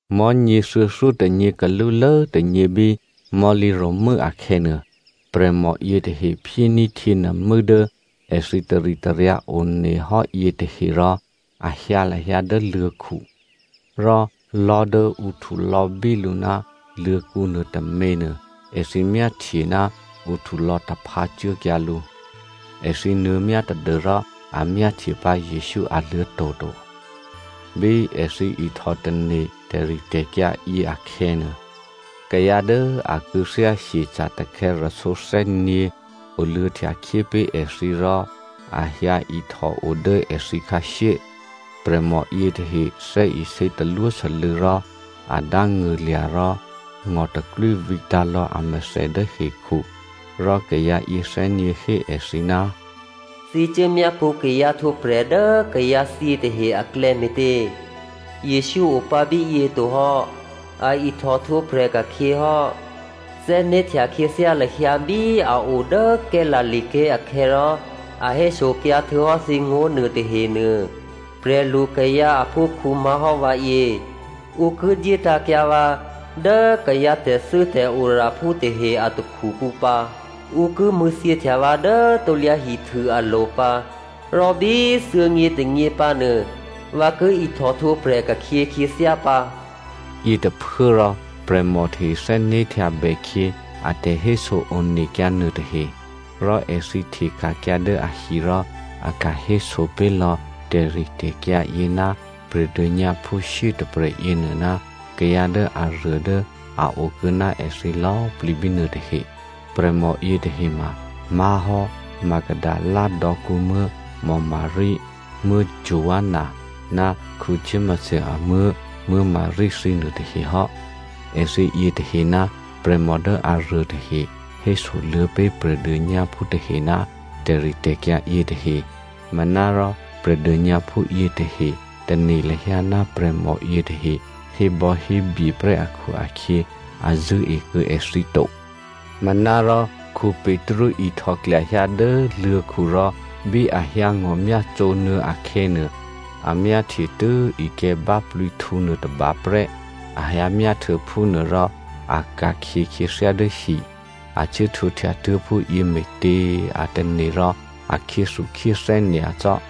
Mò̤́nyě thuô̌thyótônyě kalúlố tônyě bí mò̤́lǐro̤mû́ akhè̌nuô, prè̤mò yětahe phyéní̤ htyěnuô̤mû́ dố èthǐ taritaryǎ one hò́ yětahe rò a hyǎ lahyǎ dố luô̤̌khu. Rò lò̤́ dố ǔ htulò̌bí lǔ ná luô̤̌kǔ nuôtôměnuô, èthǐ myáhtye ná ǔ htulò̌taphǎ cuốkyǎ lǔ. Èthǐ nuô̌myá tadû́rò a myáhtye pǎ Jesǔ aluô̤̌to̤ to. Bí èthǐ ihtò tane̤ tè̤ritè̤kyǎ yěakhè̌nuô, kayǎ dố a kû̌thyá hyeca̤ takhè̌rasǒ thè́nyě̤ oluô̌htyakhyé pé̤ èthǐ rò a hyǎihtòo dố èthǐ khǎshyé. Prè̤mò yětahe thè́isě talwósû́lû̌ rò a dángṳ̂lya̤ rò ngò̤taklwí vǐtǎ̤lò̌ amèthè dố hekhu, rò kayǎ yěthè́nyě̤ hé èthǐ, “Thǐ cuốmyápṳ̌ kayǎ htwǒprè̤ dố kayǎ thyě tahe aklè̌ me̤tě? Jesǔ opǎ bíyě to hò́, a ihtò htwǒprè̤ ka̤khyě hò́. Thè́né̤htya khyěthyá lahyǎ bí a o dố Galilea ké̤ akhè̌ rò a hésokyǎ htuô̌hò́ thǐ ngó̤ nuôtahenuô. ‘Prè̤lukayǎ aphúkhǔ má̤hò́ vǎyě, ǔ ki dyétǎ̤kyǎ vǎ dố kayǎ tè̤thû́tè̤oraphú tahe a takhukǔ pǎ. Ǔ ki mṳ̂̌thyěhtya vǎ dố krusu alo̤ pǎ, rò bí thuô̌nyětônyě pǎnuô, vǎ ki ihtò htwǒprè̤ ka̤khyě khyěthyá pǎ.’” Yětôphuốrò prè̤mò tahe thè́né̤htyabè khyě a tè̤héso onekyǎ nuôtahe. Rò èthǐ hteka̤kyǎ dố ahi rò a ka̤héso pé̤ lò̌ tè̤ritè̤kyǎ yě ná prè̤dônyǎphú shyétôprè̤ yěnuô ná kayǎ dố aruô dố a okuô̌ ná èthǐ lò̌꤮ plǐ bínuô tahe. Prè̤mò yětahe ma má̤hò́ Magdalena dò̌kǔmuố̤ Maria, Joanna ná Jakomo amuố̤ Maria thǐnuô tahe hò́. Èthǐ yětahe ná prè̤mò dố aruô tahe hésoluô̌ pé̤ prè̤dônyǎphú tahe ná tè̤ritè̤kyǎ yětahe. Manárò prè̤dônyǎphú yětahe tane̤ lahyǎ ná prè̤mò yětahe hébò̌hébye prè́ akhu-akhyě a zṳ̂́e kuô̌ èthǐ to. Manárò Petru ihtòklyahyǎ dố luô̤̌khu rò bí a hyǎngò̤myácǒ nuô̌ akhè̌nuô, a myáhtye tû́ ikè̤̌ báplǐhtǔ nuôtôba prè́. A hyǎmyá htuô̌ phúnuôrò a ka̤khyě khyěthyá dố hi. A cuốhtwǒhtya tuố̤ phúyě me̤tě a tane̤ rò a khyéthukhyéthè́ nyacò́.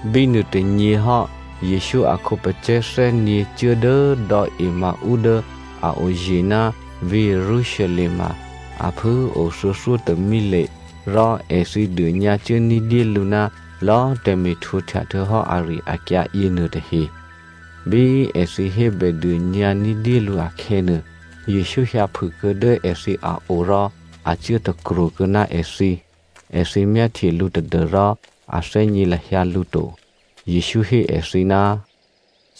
Bínuôtônyě hò́, Jesǔ a khǒpacè̤̌ thè́nyě̤ cuố dố dò̌ Emmao dố a oye̤ ná vǐ̤ Jerusalem ma a phû꤮ o thuô̌thyótômile. Rò èthǐ dônyǎcuố ní̤dyélǔ ná lò̌꤮ tè̤me̤htwǒhtya htuô̌hò́ ari-akyǎ yěnuôtahe. Bí èthǐ hébèdônyǎ ní̤dyélǔ akhè̌nuô, Jesǔ hyǎphûkuô̌ dố èthǐ a o rò a cuố takro̤ kuô̌ ná èthǐ. Èthǐ myáhtye lǔ tadû́rò a thè́gně lahyǎ lǔ to. Jesǔ hé èthǐ,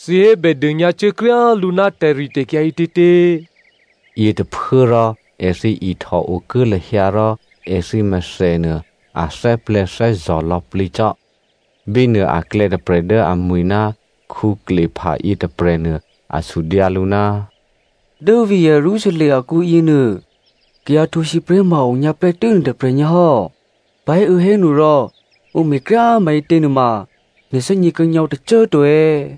“Thǐ hébèdônyǎcuố kryá lǔ ná tè̤ritè̤kyǎ ǐtětě?” Yětôphuốrò èthǐ ihtòokuố lahyǎ rò èthǐ mèthènuô, a thè́plè̤̌thè́zò̤ lò̌plǐ cò́. Bínuô aklè̌ tôprè̤ dố amwi̤ ná Cleopa yětôprè̤nuô a sudyǎ lǔ, “Dố vǐ̤ Jerusalem akǔ yěnuô, kayǎ htwǒsǐpré̤ ma a onyǎ prè́tû́ nè̤tôprè̤ nyǎ hò́. Pahéuô̌hénu rò ǔ me̤kryá꤮ maǐtě nuôma nè̤ thè́gně kuô̌ nyǎ ǔ tôcô꤮ to è̌?”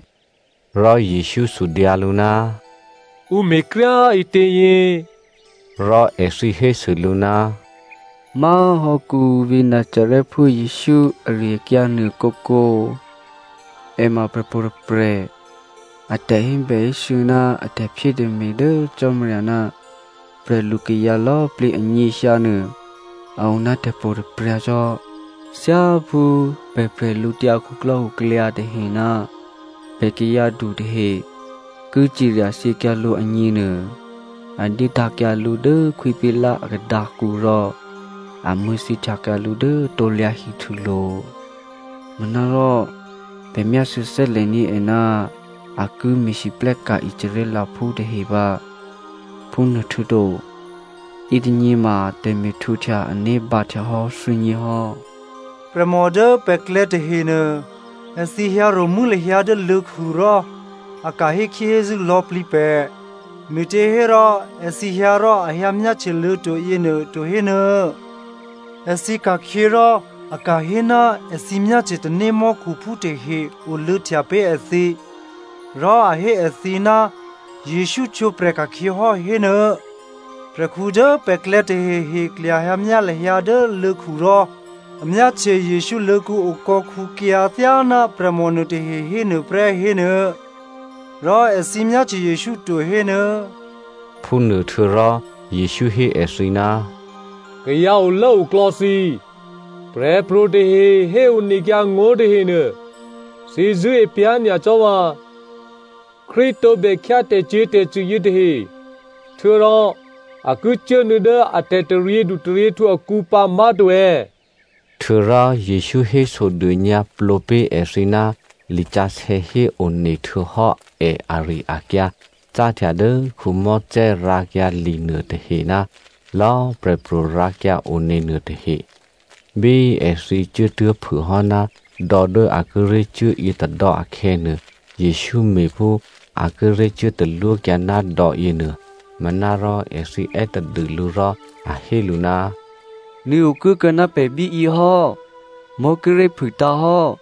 Rò Jesǔ sudyǎ lǔ, “Ǔ me̤ kryá꤮ ǐtě?” Rò èthǐ hésû lǔ, “Má̤hò́ vǐ̤ Nazarèphú Jesǔ ari-akyǎ nuô kǒkǒ꤮. È ma prè̤pro̤ tôprè̤. A tè̤hébèhésû̌ ná a tè̤phyétè̤me̤ dố Cò́marya ná prè̤lukayǎ lò̌꤮ plǐ anyěhyǎ nuô, a o ná tè̤pro̤tè̤prya̤ cò́. Thyáphú pè̤ bwídukhu tahe ná pè̤ kayǎdu tahe ki cirya thyěkyǎ lǔ agněnuô a dyétǎ̤kyǎ lǔ dố Khwí Pilato a khadǎkǔ rò a mṳ̂̌thyěhtyakyǎ lǔ dố krusulo̤. Manárò pè̤ myásû̌ thè́lè̤ní̤ è ná a ki me̤lwóhteka̤ Israelphú tahe pǎ. Phúnuôhtuô̌to, yětônyěma tè̤me̤htwǒhtya ané̤ bǎhtyahò́ thuô̌nyě hò́. Prè̤mò dố pè̤klè̌ tahenuô, èthǐ hyǎ ro̤mû́ lahyǎ dố luô̤̌khu rò a ka̤ hékhyéhézû́ lò̌plǐ pè̤. Me̤těhérò èthǐ hyǎ rò a hyǎ myáhtye luô̤̌to̤ yěnuô to hénuô̌꤮. Èthǐ ka̤khyě rò a ka̤hé ná èthǐ myáhtye tanémò́khuphú tahe oluô̌htya pé̤ èthǐ, rò a hé èthǐ ná Jesǔ htwǒprè̤ ka̤khyě hò́, hénuô̌. Prè̤khǔ dố pè̤klè̌ tahehe klyahyǎmyá lahyǎ dố luô̤̌khu rò a myáhtye Jesǔ luô̤̌kǔ okò̌khǔkyǎ thyáná prè̤mò nuôtahe hénuôprè́ hénuô̌. Rò èthǐ myáhtye Jesǔ to, hénuô̌.” Phúnuô htuô̌rò Jesǔ hé èthǐ, “Kayǎ olốoklò̌ thǐ꤮ prè̤pro̤ tahe héonekyǎ ngó̤ tahenuô, thǐ zṳ̂́e pyá̤ nyacò́ vǎ꤮! Krístu tǒbè khyá tè̤cyě̤tè̤cṳ̂ yětahe htuô̌rò a ki cuốnuô̌ dố a tè̤taryědu taryěhtǔ akǔ pǎ má̤to è̌?” Htuô̌rò Jesǔ hésodônyǎplǒ pé̤ èthǐ ná lisǎsè̌ héone htuô̌hò́ è ari-akyǎ cáhtya dố Mosè rǎkyǎ li nuôtahe ná lò̌꤮ prè̤pro̤ rǎkyǎone nuôtahe. Bí èthǐ cuốtuố̤phûhò́ ná dò̌ dố a kíré̤ cuố yětôdò̌ akhè̌nuô, Jesǔ me̤ phú a kíré̤ cuố talwókyǎ ná dò̌yěnuô. Manárò èthǐ è́ tadû lǔ rò a hé lǔ, “Nuô̌ okuốkuô̌ ná pè̤ bíyě hò́, mò̤́ kíré̤ phûtǎ̤hò́,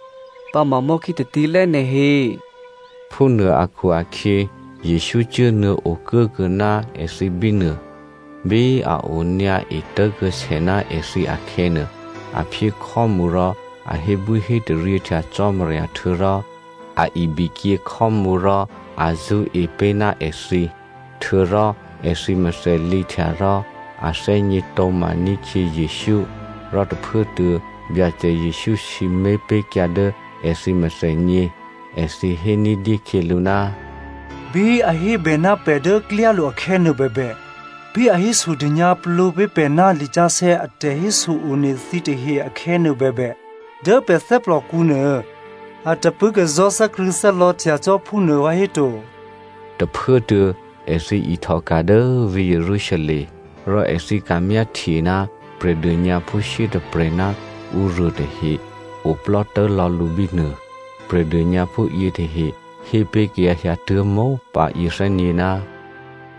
pǎma mò̤́khí tatílè́ nè̤ he.” Phúnuô akhu-akhyě Jesǔ cuốnuô̌ okuốkuô̌ ná èthǐ bínuô. Bí a onyǎ etố̤kuô̌sè ná èthǐ akhè̌nuô, a phyé khò́mǔ rò a hébwíhétaryěhtya Cò́marya htuô̌rò a ibikyě khò́mǔ rò a zṳ́e pé̤ ná èthǐ. Htuô̌rò èthǐ mèthè lǐhtya rò a thè́gně tǒ̤maní̤ khyě Jesǔ, rò tôphuốtuô̌ Byacè Jesǔ sǐmé̤ pé̤kyǎ dố èthǐ mèthènyě. Èthǐ hé ní̤dyé khyělǔ, “Bí a hébè ná pè̤ dố klyálo̤ akhè̌nuô bèbè, bí a hésodônyǎplǒ pé̤ pè̤ ná lisǎsè̌ a tè̤héso-one thǐtahe akhè̌nuô bèbè, dố pè̤ thè́plòkǔ nuô, a tapṳ̂́kazò̤́ thè́krṳ̂̌thè́lò̌htya cò́ phúnuô vǎhéto?” Tôphuốtuô̌ èthǐ ihtòka̤ dố vǐ̤ Jerusalem. Rò èthǐ ka̤myáhtye ná prè̤dônyǎphú shyétôprè̤ ná ǔruô tahe oplò́ tố̤lò̌ lǔ bínuô. Prè̤dônyǎphú yětahe hé pé̤ kayǎ hyǎtuố̤ mópǎ yěthè́nyě̤,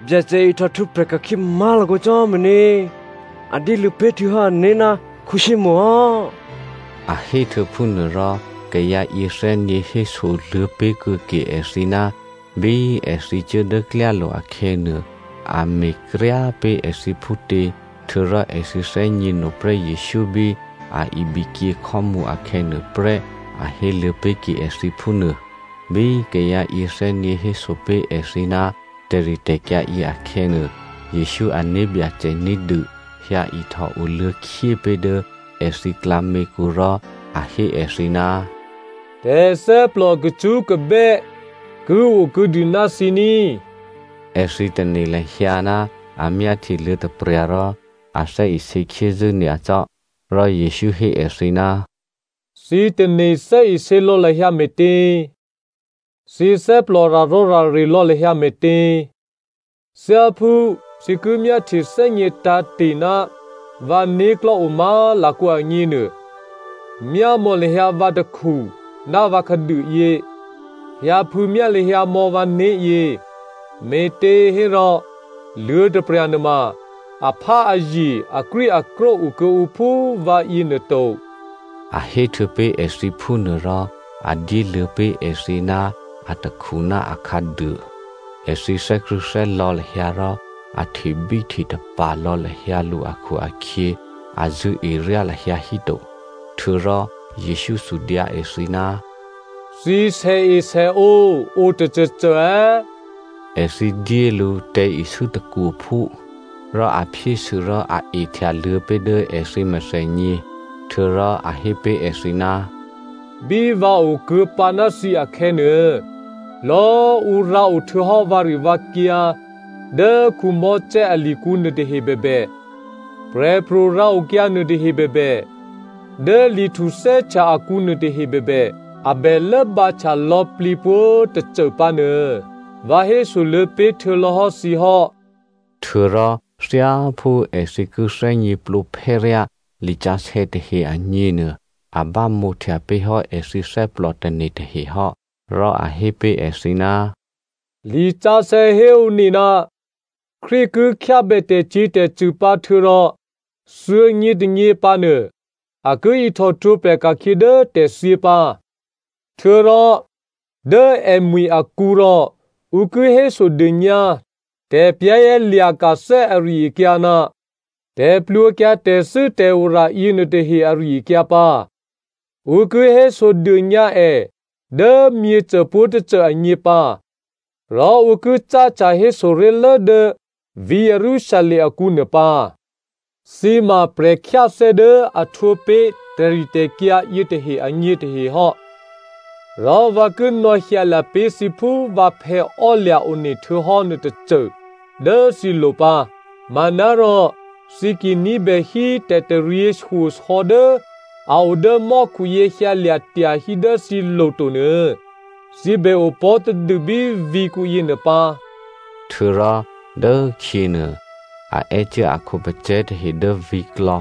“Byacè ihtò htwǒprè̤ ka̤khyě má̤lakǒ cò́ hò́ meně. A dyéluô̌ pé̤ htuô̌hò́ ané̤ ná Simonè hò́!” A héhtuô̌phúnuô rò kayǎ yěthè́nyě̤ hésoluô̌ pé̤kuô̌ke èthǐ ná bí èthǐ cuố dố klyálo̤ akhè̌nuô, a me̤kryá pé̤ èthǐ phútě, htuô̌rò èthǐ thè́gněno prè́ Jesǔ bí a ibikyě khò́mǔ akhè̌nuô prè́, a héluô̌ pé̤ke èthǐ phúnuô. Bí kayǎ yěthè́nyě̤ hésopé̤ èthǐ ná tè̤ritè̤kyǎ yě akhè̌nuô, Jesǔ ané̤ Byacè ní̤dû hyǎihtò oluô̌khyé pé̤ dố èthǐ klǎměkǔ rò a hé èthǐ, “Tè̤thè́plò kacṳ́kabè́ ki okuô̌dû ná thǐ ní꤮.” Èthǐ tane̤ lahyǎ ná a myáhtye luô̤̌taprya̤ rò a thè́isě khyézû́ nyacò́. Rò Jesǔ hé èthǐ, “Thǐ tane̤ thè́isě lò̌ lahyǎ me̤tě? Thǐ thè́plò rarò̌rare lò̌ lahyǎ me̤tě? Thyáphú thǐ ki myáhtyethè́gně tǎ̤te̤ ná vǎ né̤klò̤́ o má̤lakǒ agněnuô, myámò̌ lahyǎ vǎ takhu ná vǎ khǎduôyě, hyǎphû̌myá lahyǎ mò̌ vǎné̤yě, me̤těhérò, luô̤̌taprya̤ nuôma, apháazye akrwíakrwó okuô̌ǔ phú vǎ yěnuô to.” A héhtuô̌ pé̤ èthǐ phúnuôrò a dyéluô̌ pé̤ èthǐ ná atakhu ná akhǎduô. Èthǐ thè́krṳ̂̌thè́lò̌ lahyǎ rò a htebíhtetapa̤ lò̌ lahyǎ lǔ akhu-akhyě, a zṳ̂́eryá lahyǎ híto. Htuô̌rò Jesǔ sudyǎ èthǐ, “Thǐ sèesèǒ o tôcôcô è̌?” Èthǐ dyé lǔ tè̤̌isû́ tôkwophú. Rò a phyésû rò a ehtyaluô̌ pé̤ dố èthǐ mèthènyě. Htuô̌rò a hé pé̤ èthǐ, “Bí vǎ okuô̌pǎ ná thǐ akhè̌nuô, lò̌꤮ ǔ rǎo htuô̌hò́ vǎrivǎkyǎ dố Mosè alikǔ nuôtahe bèbè, prè̤pro̤ rǎokyǎ nuôtahe bèbè, dố Li Htuthè́htya akǔ nuôtahe bèbè, a bè lốbǎhtya lò̌plǐ pwǒ̤꤮ tôcô pǎnuô, vǎ hésoluô̌ pé̤ htuô̌lò̌hò́ thǐ hò́.” Htuô̌rò thyáphú èthǐ ki thè́gněplǒphè́ryá lisǎsè̌ tahe agněnuô, a bámǒhtya pé̤hò́ èthǐ thè́plòtane̤ tahe hò́. Rò a hé pé̤ èthǐ, “Lisǎsè̌ héone, Krístu ki khyábè tè̤cyě̤tè̤cṳ̂ pǎ htuô̌rò thuô̌nyětônyě pǎnuô, a ki ihtòhtwǒprè̤ ka̤khyě dố tè̤thyě pǎ. Htuô̌rò dố èmwi̤ akǔ rò ǔ ki hésodônyǎ tè̤za̤ ní̤ ari-akyǎ ná tè̤plwǒkyǎ tè̤thû́tè̤ora yěnuôtahe ari-akyǎ pǎ. Ǔ ki hésodônyǎ è dố myěcô pwǒ̤tôcô agně pǎ, rò ǔ ki cáhtya hésoré̤lố dố vǐ̤ Jerusalem akǔ nuôpǎ. Thǐ ma prè̤khyáthè́ dố a htwǒ pé̤ tè̤ritè̤kyǎ yětahe agně tahe hò́. Rò vǎ ki nò̌hyǎlya̤ pé̤ thǐ phú vǎphè̌ ò́lya̤ one htuô̌hò́ nuôtôcô dố thǐlo̤ pǎ. Manárò thǐ ki ní̤bè hí tè̤taryěshyosò̌ dố a o dố mò́khuyě hyǎlya̤ tyahí dố thǐlo̤ to nuô, thǐ bè opò̤́tadû bí vǐ̤kǔ yěnuô pǎ.” Htuô̌rò dốkhyěnuô, a è́cuố a khǒpacè̤̌ tahe dố vǐ̤klò̌,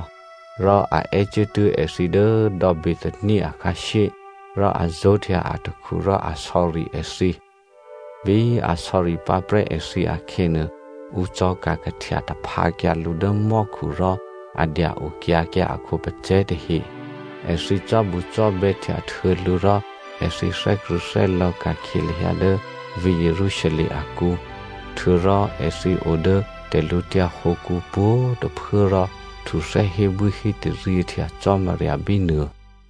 rò a è́cuốtuố̤ èthǐ dố dò̌ Bethania akhǎshyé, rò a zó̤htya atakhu rò a sò̌ri èthǐ. Bí a sò̌ri pǎprè́ èthǐ akhè̌nuô, ǔ cò̤̌ka̤kahtya taphǎkyǎ lǔ dố mò́khu rò a dya-okyǎ kyǎ a khǒpacè̤̌ tahe. Èthǐ cò́bucò́bè̌htya htuô̌ lǔ rò èthǐ thè́krṳ̂̌thè́lò̌ ka̤khyě lahyǎ dố vǐ̤ Jerusalem akǔ. Htuô̌rò èthǐ o dố tè̤lǔtyǎ hǒkǔ pwǒ̤꤮ tôphuố rò htuthè́ hébwíhétaryěhtya Cò́marya bínuô.